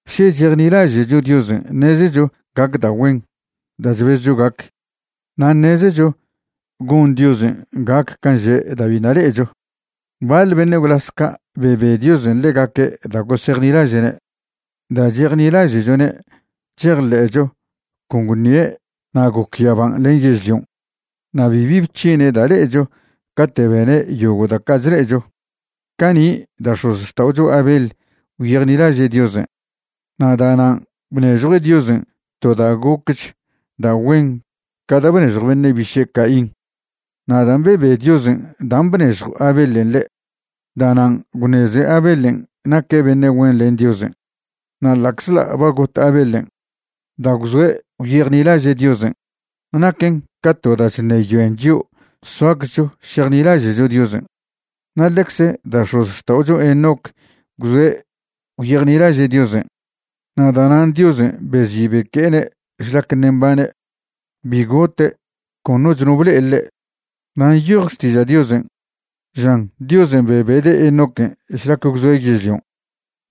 Še chejnilaže'cho Diosen' ṉezecho gac da' güen da' chbezcho gac, na' ṉezecho gon Diosen' gac can' že' da' biṉa' le'echo. Baḻ beṉe' gwlas ca' bebe Diosen' ḻegaque' da' gosejnilaže'ne'. Da' chejnilaže'chone' chejḻe'cho con gwṉie' na' goc yaban' len yežlion'. Na' bibi bc̱hine' da' le'echo cate' bene' yogo' da' ca' chle'echo. Cani' da' x̱ozxta'ocho Abel gwyejnilaže' Diosen' na' da'nan' bnežjue' Diosen' to da' gocch da' güen ca da' bnežjw beṉe' biše' Caín. Na' dan' bebe Diosen' dan' bnežjw Abelen' ḻe', da'nan' gwṉeze Abelen' naque' beṉe' güen len Diosen'. Na' ḻa'czḻa' ba got Abelen', da' gwzoe' gwyejnilaže' Diosen', naquen ca to da' chṉeyoen chio' soaczcho šejnilaže'cho Diosen'. Na' ḻecze da' x̱ozxta'ocho Enoc gwzoe' gwyejnilaže' Diosen', na' da'nan' Diosen' bezi' beque'ene' šlac ṉe' mbane'. Bi gote', con noch no ble'e ḻe'. Na' nyoj Xtiža' Diosen', žan Diosen' bebede' Enoquen' šlac gwzoe' yežlion'.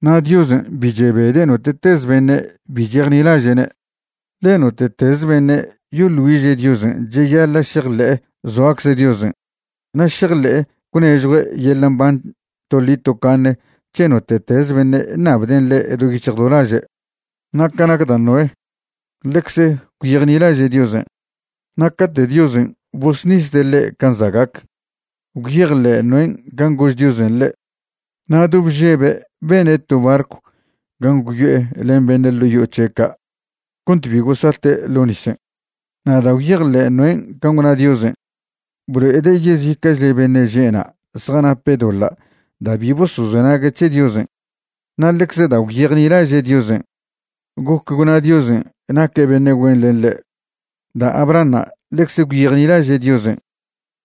Na' Diosen' bi chebede' note'teze beṉe' bi chejnilaže'ne'. Ḻe note'tez beṉe' yoḻ güiže' Diosen' cheyaḻa' šejḻe'e zoacze Diosen' na' šejḻe'e gwnežjue' yeḻa' mban toḻi tocaṉe c̱he note'tez beṉe' ṉabden' ḻe' do yic̱hj do laže'. Na' ca nac da' Noé, ḻecze gwyejnilaže' Diosen', na' cate' Diosen' bosṉisde' ḻe' can' za' gac, gwyejḻe' Noén' can' gož Diosen' ḻe', na' do bžebe' bene' to barcw gan' gwyo'e len beṉe' ḻo' yo'o c̱he' ca' cont bi gosate' ḻo nisen'. Na' da' gwyejḻe' Noén' can' gwna Diosen', blo'ede' yezica'chle beṉe' že' na' zjanape' doḻa' da' bi bosozenague' c̱he Diosen'. Na' ḻecze da' gwyejnilaže' Diosen', goc gwna Diosen' naque' beṉe' güen len ḻe'. Da' Abrahanṉa' ḻecze gwyejnilaže' Diosen'.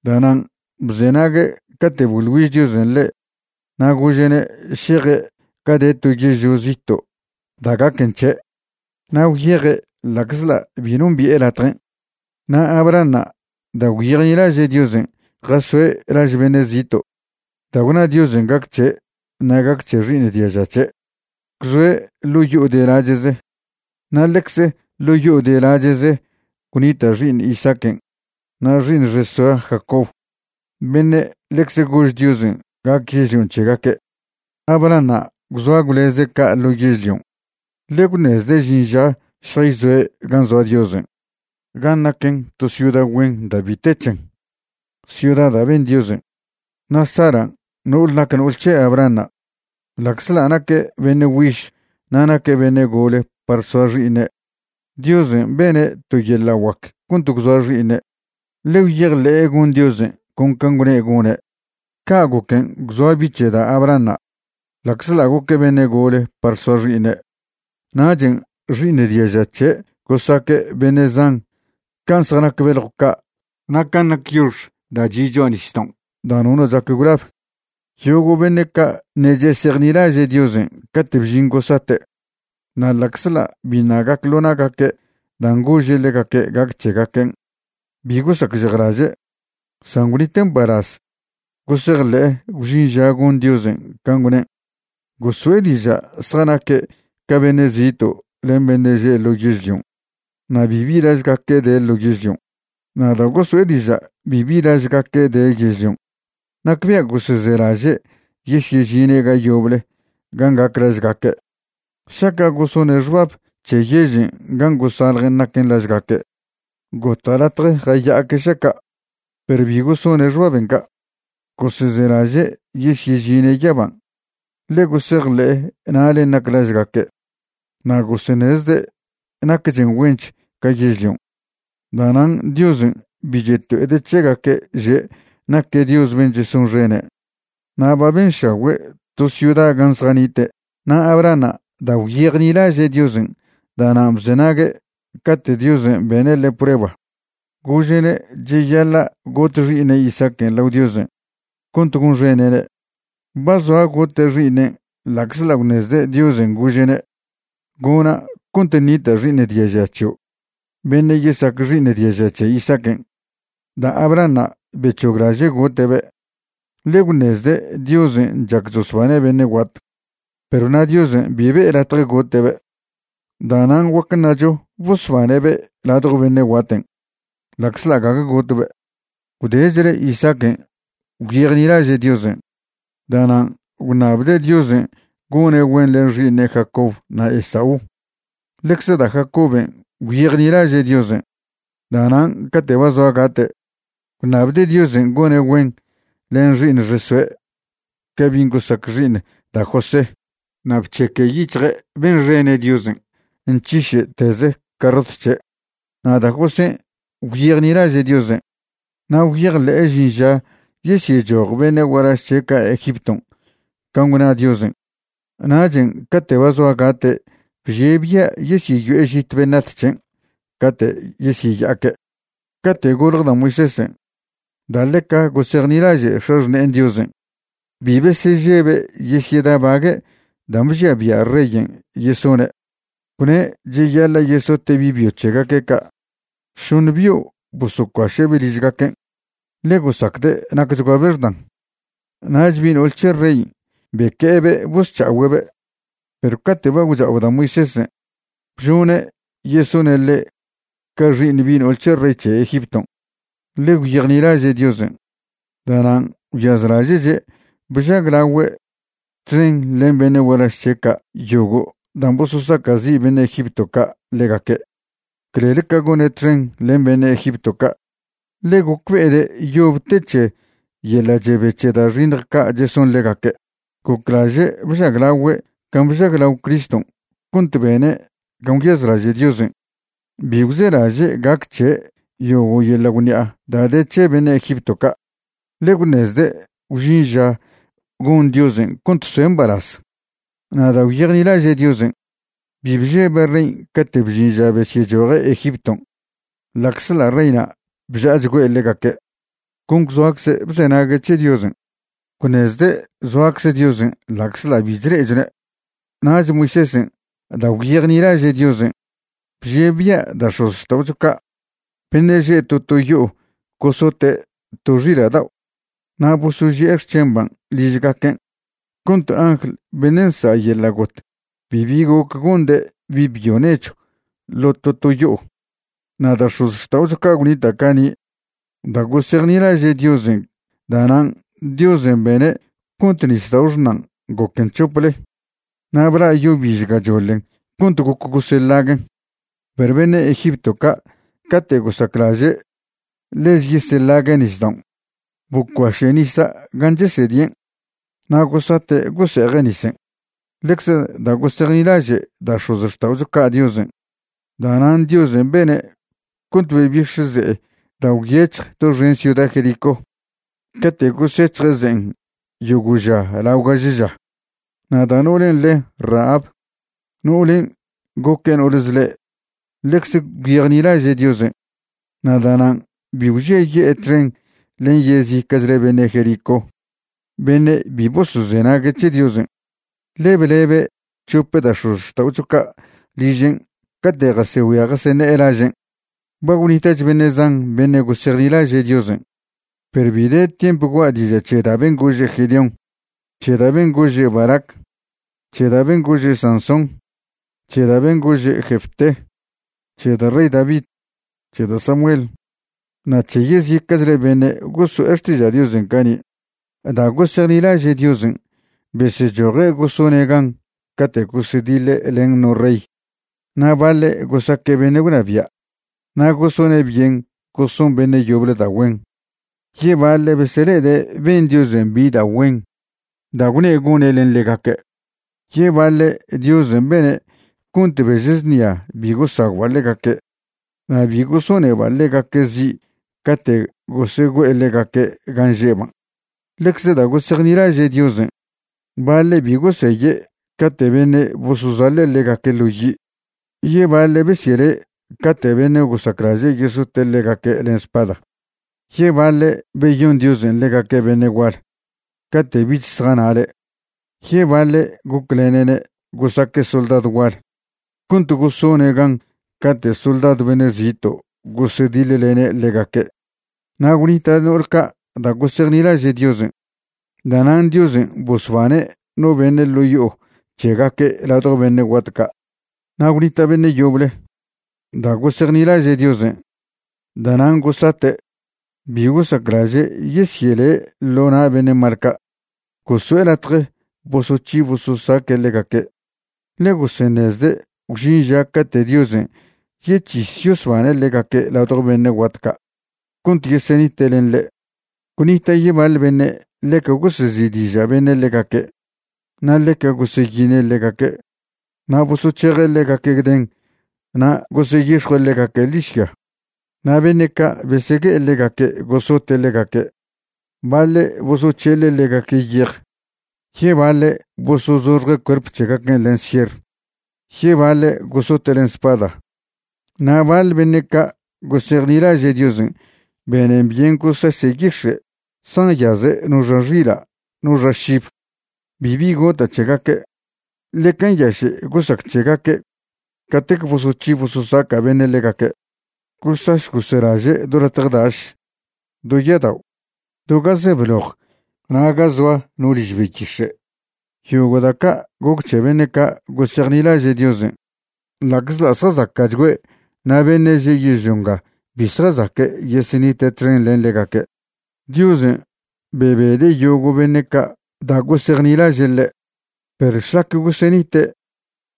Da'nan' bzenague' cate' boḻ güiž Diosen' ḻe' na' gože'ne' šeje' ga de to yežlio zito' da' gaquen c̱he'. Na' gwyeje' ḻa'czḻa' bi nombi'e latjen'. Na' Abrahanṉa', da' gwyejnilaže' Diosen' jasoe' laž beṉe' zito' da' gwna Diosen' gac c̱he' na' gac c̱he xi'iṉ diaža c̱he'. Gwzoe' ḻo' yo'o de lache'ze na' ḻecz ḻo' yo'o de lache'ze gwnita' xi'iṉe' Isaaquen' na' xi'iṉ xesoe' Jacob beṉe' ḻecze gož Diosen' gac yežlion' c̱hegaque'. Abrahanṉa' gwzoa gwleze' ca' ḻo yežlion', ḻe gwṉezde' žin ža šjayzoe' gan' zoa Diosen' gan' naquen to ciuda güen da' bi te c̱hen, ciuda da' ben Diosen'. Na' Saran' no'ol nac no'ol c̱he Abrahanṉa', ḻa'czḻa' naque' beṉe' güiž na' naque' beṉe' gole par soa xi'iṉe', Diosen' bene' to yeḻa' guac cont gwzoa xi'iṉe', ḻe gwyejḻe'e gon Diosen' con can' gwne' gone'. Ca' goquen' gwzoa bi' c̱he da' Abrahanṉa' ḻa'czḻa' goque' beṉe' gole par soa xi'iṉe', nachen' xi'iṉ diaža c̱he' gosaque' beṉe' zan can' zjanac beljw ca' na' can' nac yox da' chi' cho'a nisdaon' da' nono chac gwlab. Yogo' beṉe' ca' ṉe' chesejnilaže' Diosen' cate' bžin gosate'. Na' ḻa'czḻa' biṉa' gac ḻo na'gaque' dan' gože' ḻegaque' gac c̱hegaquen', bi gosacžejlaže', san gwnite' mbalaz gosejḻe'e gwžin ža gon Diosen' can' gwnen'. Goso'e diža' zjanaque' ca beṉe' zito' len beṉe' že' ḻo yežlion' na' bibi lažgaque' de ḻo yežlion'. Na' da' goso'e diža' bibi lažgaque' de yežlion', nacbia' gosezelaže' yesyežine' ga yoble gan' gac lažgaque'. Šaca' gosone' xbab c̱he yežen' gan' gosaljen' naquen lažgaque', gota' latje jaya'aque' šaca', perw bi gosone' xbaben' ca'. Gosezelaže' yesyežine' yaban', ḻe gosejḻe'e na'len' nac lažgaque', na' goseṉezde' nacchen güench ca yežlion'. Da'nan' Diosen' bi cheto'ede' c̱hegaque' že' naque' Dios ben' chesonxene', na' ba benšagüe' to ciuda gan' zjanite'. Na' Abrahanṉa' da' gwyejnilaže' Diosen' da'nan' bzenague' cate' Diosen' bene' ḻe' prueba gože'ne' cheyaḻa' got xi'iṉe' Isaaquen' lao Diosen' cont gonxene'ne'. Ba zoa gote' xi'iṉen' ḻa'czḻa' gwṉezde' Diosen' gože'ne': “Gona' cont ṉita' xi'iṉ diaža c̱hio' beṉe' yesac xi'iṉ diaža c̱he Isaaquen'.” Da' Abrahanṉa' bec̱hoglaže' gote'be', ḻe gwṉezde' Diosen' chac chosbane' beṉe' guat. Perw na' Diosen' bi be'e latje gote'be'. Da'nan' guac ṉacho bosbane'be' ladjo beṉe' guaten', ḻa'czḻa' gague gotbe'. Gwdechle Isaaquen' gwyejnilaže' Diosen'. Da'nan' gwṉabde' Diosen' gone' güen len xi'iṉe' Jacob na' Esaú. Ḻecze da' Jacoben' gwyejnilaže' Diosen'. Da'nan' cate' ba zoa gate', gwṉabde' Diosen' gone' güen len xi'iṉ xesoe' ca' bin' gosac xi'iṉ da' José. Na' bc̱heque' yic̱hje' benxene' Diosen' nc̱hiše'teze' carrot c̱he'. Na' da' Josén' gwyejnilaže' Diosen', na' gwyejḻe'e žin ža yesyechoj beṉe' gualaž c̱he' ca' Egipton' can' gwna Diosen'. Nachen' cate' ba zoa gate' bžie' bia' yesyeyo'e žit beṉat c̱hen' cate' yesyeya'aque'. Cate' golje da' Moisésen', da' ḻeca gosejnilaže' x̱axṉe'en Diosen', bi besežebe' yesyedabague' dan' bžia bia' reyen' yesone', gwne' cheyaḻa' yesote' bi' byo c̱hegaque' ca'. Šoṉe bio' bosocuaše'be' ližgaquen', ḻe gosacde' nacchguabe' xdan. Nach bi' no'ol c̱he rey beque'ebe' bosc̱ha'ogüe'be'. Perw cate' ba gwcha'o da' Moisésen' bžone' yesone' ḻe' ca xi'iṉ bi' no'ol c̱he rey c̱he Egipton', ḻe gwyejnilaže' Diosen'. Da'nan' gwyazlaže'che' bžaglagüe' txen len beṉe' gualaž c̱he' ca' yogo' dan' bososaca'zi' beṉe' Egipto ca' ḻegaque', clel ca gone' txen len beṉe' Egipto ca', ḻe gocbe'ede' yob te c̱he yeḻa' chebe c̱he da' xiṉj ca' cheson ḻegaque'. Goclaže' bžaglagüe' can' bžaglao Criston' cont bene' can' gwyazlaže' Diosen', bi gwzelaže' gac c̱he' yogo' yeḻa' gwṉi'a da' de c̱he beṉe' Egipto ca', ḻe gwṉezde' gwžin ža gon Diosen' cont soe' mbalaz. Na' da' gwyejnilaže' Diosen', bi bžebe' rey cate' bžin ža besyechoje' Egipton' ḻa'czḻa' reyna' bža'achgüe' ḻegaque', con gwzoacze' bzenague' c̱he Diosen'. Gwṉezde' zoacze Diosen' ḻa'czḻa' bi chle'echone'. Nach Moisésen' da' gwyejnilaže' Diosen' bžie' bia' da' x̱ozxta'ocho ca', beṉe' že' to to yo'o gosote' to xila' dao' na' bosoži'e xc̱hemban' ližgaquen', cont angl beṉe' nsa' yeḻa' got bibi goc gonde' bi' byo nechw ḻo' to to yo'o. Na' da' x̱ozxta'ocho ca' gwnita' cani', da' gosejnilaže' Diosen' da'nan' Diosen' bene' cont Nisdao' Xṉan' goquen c̱hople, na' bla' yo biž gachoḻen cont goc goseḻaguen'. Perw beṉe' Egipto ca' cate' gosaclaže' ḻeze yeseḻague' nisdaon', bocuaše' nisa' gan' chesedien', na' gosate' gose'eje' nisen'. Ḻecze da' gosejnilaže' da' x̱ozxta'ocho ca' Diosen', da'nan' Diosen' bene' cont bebix̱ ze'e da' gwyec̱hj doxen ciuda Jericó cate' gosec̱hje' ze'en yogo' ža lao gaže ža. Na' da' no'olen' le' Rahab, no'olen' goque' no'ol zḻe', ḻecze gwyejnilaže' Diosen', na' da'nan' bi gwžiaye'e txen len yezica'chle beṉe' Jericó beṉe' bi bosozenague' c̱he Diosen', ḻe blebe' chop da' x̱ozxta'ocho ca' ližen' cate' jasegüia jaseṉe'e lažen'. Ba gwnita'ch beṉe' zan beṉe' gosejnilaže' Diosen', perw bi de tiemp gua' diža' c̱he da' ben' gože' Gedeón, c̱he da' ben' gože' Barac, c̱he da' ben' gože Sansón, c̱he da' ben' gože' Jefté, c̱he da' rey David, c̱he da' Samuel, na' c̱he yezica'chle beṉe' goso'e xtiža' Diosen' cani'. Da' gosejnilaže' Diosen' besechoje' gosone' gan cate' gosediḻe' len no rey, na' baḻe' gosaque' beṉe' gwnabia' na' gosone' byen goson beṉe' yoble da' güen, yebaḻe' besele'ede' ben Diosen' bi da' güen da' gwne' gone' len ḻegaque', yebaḻe' Diosen' bene' cont bež znia bi gosagwba' ḻegaque' na' bi gosoneba' ḻegaque' zi' cate' gosegüe'e ḻegaque' gan' že'ban'. Ḻecze da' gosejnilaže' Diosen', baḻe' bi goseye' cate' beṉe' bosozaḻe' ḻegaque' ḻo yi', yebaḻe' besyele' cate' beṉe' gosaclaže' yesote' ḻegaque' len spada, yebaḻe' beyon Diosen' ḻegaque' beṉe' gual cate' bich zjanale', yebaḻe' goclene'ne' gosaque' soldadw gual cont gosone' gan cate' soldadw beṉe' zito' gosediḻlene' ḻegaque'. Na' gwnita' no'ol ca' da' gosejnilaže' Diosen' da'nan' Diosen' bosbane' no beṉe' ḻo' yo'o c̱hegaque' ladjo beṉe' guat ca'. Na' gwnita' beṉe' yoble, da' gosejnilaže' Diosen' da'nan' gosate', bi gosaclaže' yesyele' ḻo na' beṉe' mal ca'. Goso'e latje bosoc̱hi bososaque' ḻegaque', ḻe goseṉezde' gwžin cate' Diosen' yec̱his yosbane' ḻegaque' ladjo beṉe' guat ca' cont yesenite' len ḻe'. Gwnita' yebaḻ beṉe' ḻeca gosezi'diža' beṉe' ḻegaque' na' ḻeca goseyine' ḻegaque', na' bosoc̱heje' ḻegaque' gden na' goseyix̱jue' ḻegaque' ḻižya. Na' beṉe' ca' besegue'e ḻegaque' gosote' ḻegaque', baḻe' bosoc̱heḻe' ḻegaque' yej, yebaḻe' bosozoxje' cuerp c̱hegaquen' len sier, yebaḻe' gosote' len spada. Na' baḻ beṉe' ca' gosejnilaže' Diosen' benen byen gosaše' yix̱e' zjanyaze' no xa xila' no xa šib. Bibi gota' c̱hegaque', ḻeca nyaše' gosac c̱hegaque' catec bosoc̱hi bososaca' beṉe' ḻegaque'. Gosaš goselaže' do latje daš, do ya'adao', do ga ze bloj na' ga zoa no liž beyix̱e'. Yogo' da' ca' goc c̱he beṉe' ca' gosejnilaže' Diosen', ḻa'czḻa' zjazaca'chgüe' na' beṉe' že' yežlio nga bi zjazaque' yesenite' txen len ḻegaque'. Diosen' bebede' yogo' beṉe' ca' da' gosejnilaže' ḻe', perw šlac gosenite'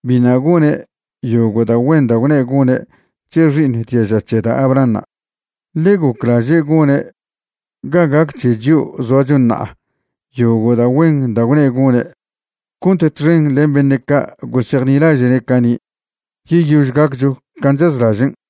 biṉa' gone' yogo' da' güen da' gwne' gone' c̱he xi'iṉ diaža c̱he da' Abrahanṉa'. Ḻe goclaže' gone' ga gac c̱he chio' zoacho ṉa'a yogo' da' güen da' gwne' gone', cont txen len beṉe' ca' gosejnilaže'ne' cani', yeyož gaccho can' chazlažen'.